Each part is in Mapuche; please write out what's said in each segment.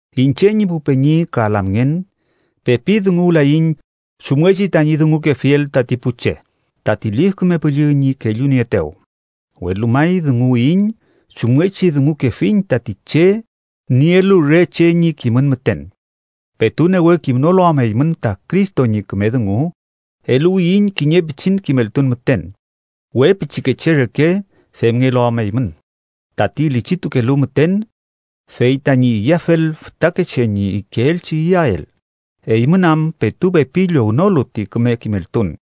Iñche ñi pu peñi ka lamngen, pepi dunguwlayiñ chumngechi tañi dungukefiel tati pu che tati Lif Küme Püllü ñi kellunieetew, welu may dunguwiyiñ chumngechi dungukefiñ tati che nielu re che ñi kimün müten, petu newe kimnolu am eymün ta Cristo ñi küme dungu. Eluwiyiñ kiñe pichin kimeltun müten, we pichikeche reke femngelu am eymün tati lichitukelu müten fey tañi iyafel fütakeche ñi ikeelchi iyael, eymün am petu pepi llownolu ti küme kimeltun,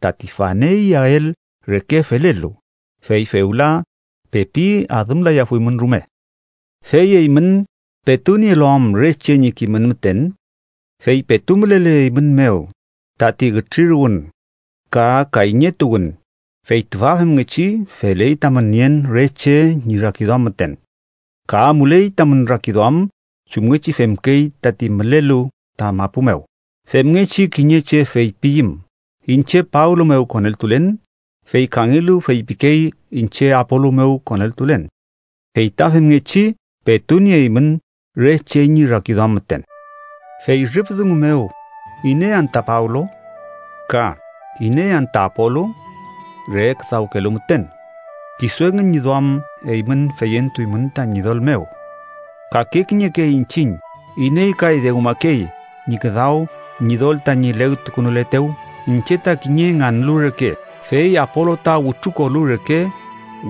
tati fane iyael reke felelu. ¡Fey fewla pepi adümlayafuymün rume! ¡Fey eymün petu nielu am re che ñi kimün müten! Fey petu mülele eymün mew tati ütriruwün ka kayñetuwün, fey tüfa femngechi feley tamün nien re che ñi rakiduam müten ka amuley tamün rakiduam chumngechi femkey tati mülelu ta mapu mew. Femngechi kiñe che feypiyüm: “Iñche Pablo mew koneltulen”, fey kangelu feypikey: “Iñche Apolu mew koneltulen” fey ta femngechi petu nieymün re che ñi rakiduam müten. Fey rüf dungu mew ¿iney anta Pablo? ka ¿iney anta Apolu? Re küdawkelu müten, kisu engün ñi duam eymün feyentuymün ta Ñidol mew, kake kiñeke iñchiñ iney kay dewmakey ñi küdaw Ñidol tañi legtukünuletew. Iñche ta kiñe nganlu reke, fey Apolu ta wütrukolu reke,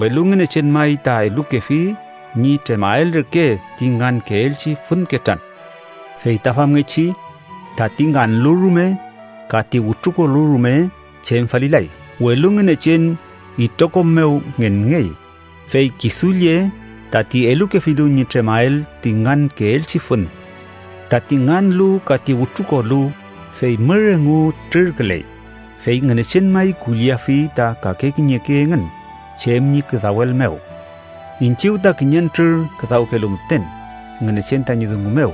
welu Ngünechen may ta elukefi ñi tremael reke ti ngankeelchi fün ketran. Fey ta femngechi tati nganlu rume ka ti wütrukolu rume chem falilay, welu Ngünechen itrokom mew ngenngey, fey kisu lle tati elukefilu ñi tremael ti ngankeelchi fün. Tati nganlu ka ti wütrukolu, fey mür engu trürküley, fey Ngünechen may kulliafi ta kake kiñeke engün chem ñi küdawel mew. Iñchiw ta kiñentrür küdawkelu müten Ngünechen tañi dungu mew,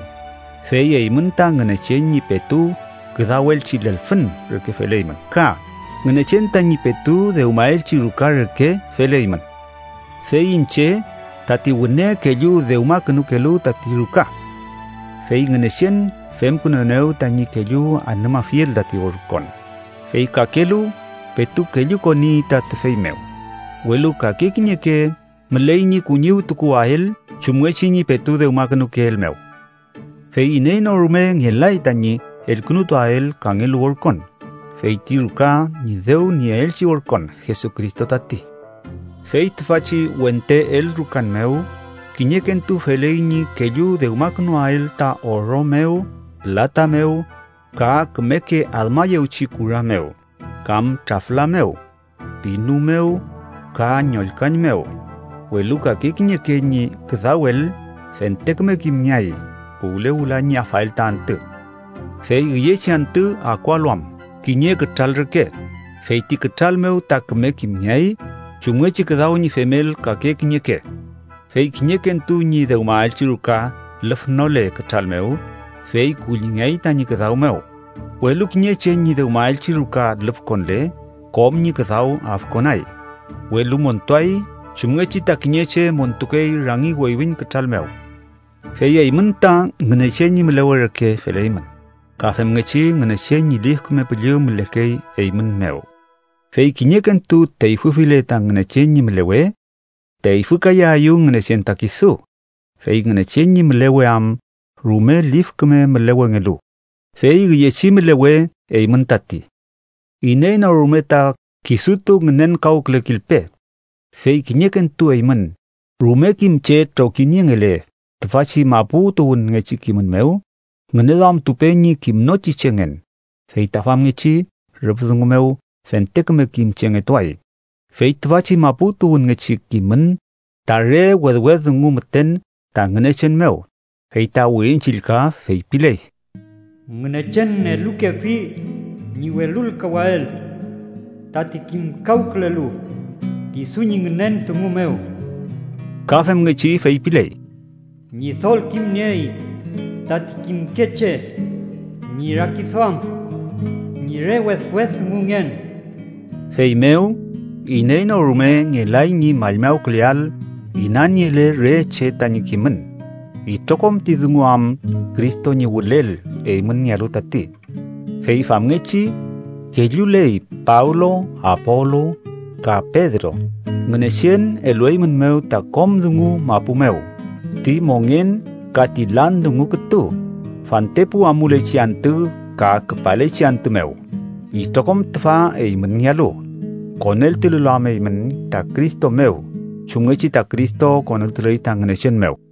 fey eymün ta Ngünechen ñi petu küdawelchi lelfün reke feleymün. Ka Ngünechen tañi petu dewmaelchi ruka reke feleymün. Fey iñche tati wüne kellu dewmakünukelu tati ruka, fey Ngünechen femkünuenew tañi kellu anümafiel tati orkon, fey kakelu petu kellukoni ta tüfey mew. Welu kake kiñeke müley ñi kuñiwtukuwael chumngechi ñi petu dewmakünukeel mew. Fey iney no rume ngelay tañi elkünutuael kangelu orkon, fey ti ruka ñi dew nieelchi orkon, Jesucristo tati. Fey tüfachi wente elrukan mew, kiñekentu feley ñi kellu dewmakünuael ta oro mew, pülata mew ka kümeke admayewchi kura mew, kam trafla mew, pinu mew ka ñolkan mew, welu kake kiñeke ñi küdawel fente küme kimngeay puwle wüla ñi afael ta antü. Fey üyechi antü akualu am kiñe kütral reke, fey ti kütral mew ta küme kimngeay chumngechi küdaw ñi femel kake kiñeke. Fey kiñekentu ñi dewmaelchi ruka lüfnole kütral mew, fey kullingeay tañi küdaw mew, welu kiñe che ñi dewmaelchi ruka lüfkonle, kom ñi küdaw afkonay, welu montuay chumngechi ta kiñe che montukey rangi weywiñ kütral mew. Fey eymün ta Ngünechen ñi mülewe reke feleymün, ka femngechi Ngünechen ñi Lif Küme Püllü mülekey eymün mew. Fey kiñekentu teyfüfile ta Ngünechen ñi mülewe, teyfükayaeyew Ngünechen ta kisu, fey Ngünechen ñi mülewe am rume lif küme mülewengelu, fey üyechi mülewe eymün tati. ¡Iney no rume ta kisutu ngünenkawkülekilpe! Fey kiñekentu eymün, rume kim che trokiniengele tüfachi mapu tuwünngechi kimün mew, ngüneduamtupe ñi kimnochi chengen, fey ta famngechi rüf dungu mew fente küme kim chengetuay. Fey tüfachi mapu tuwünngechi kimün ta re wedwed dungu müten ta Ngünechen mew. Fey ta Wirin Chillka feypiley: “Ngünechen elukefi ñi welulkawael tati kimkawkülelu kisu ñi ngünen dungu mew.” Ka femngechi feypiley: “Ñidol kimniey tati kimke che ñi rakiduam ñi re wedwed dungungen.” Feymew iney no rume ngelay ñi mallmawküleael inaniele re che tañi kimün, itrokom ti dungu am Cristo ñi wülel eymünngealu tati. Fey famngechi kelluley Pablo, Apolu, ka Pedro. Ngünechen elueymünmew ta kom dungu mapu mew, ti mongen ka ti lan dungu kütu, fantepu amulechi antü ka küpalechi antü mew. Itrokom tüfa eymünngealu, koneltulelu am eymün ta Cristo mew, chumngechi ta Cristo koneltuley ta Ngünechen mew.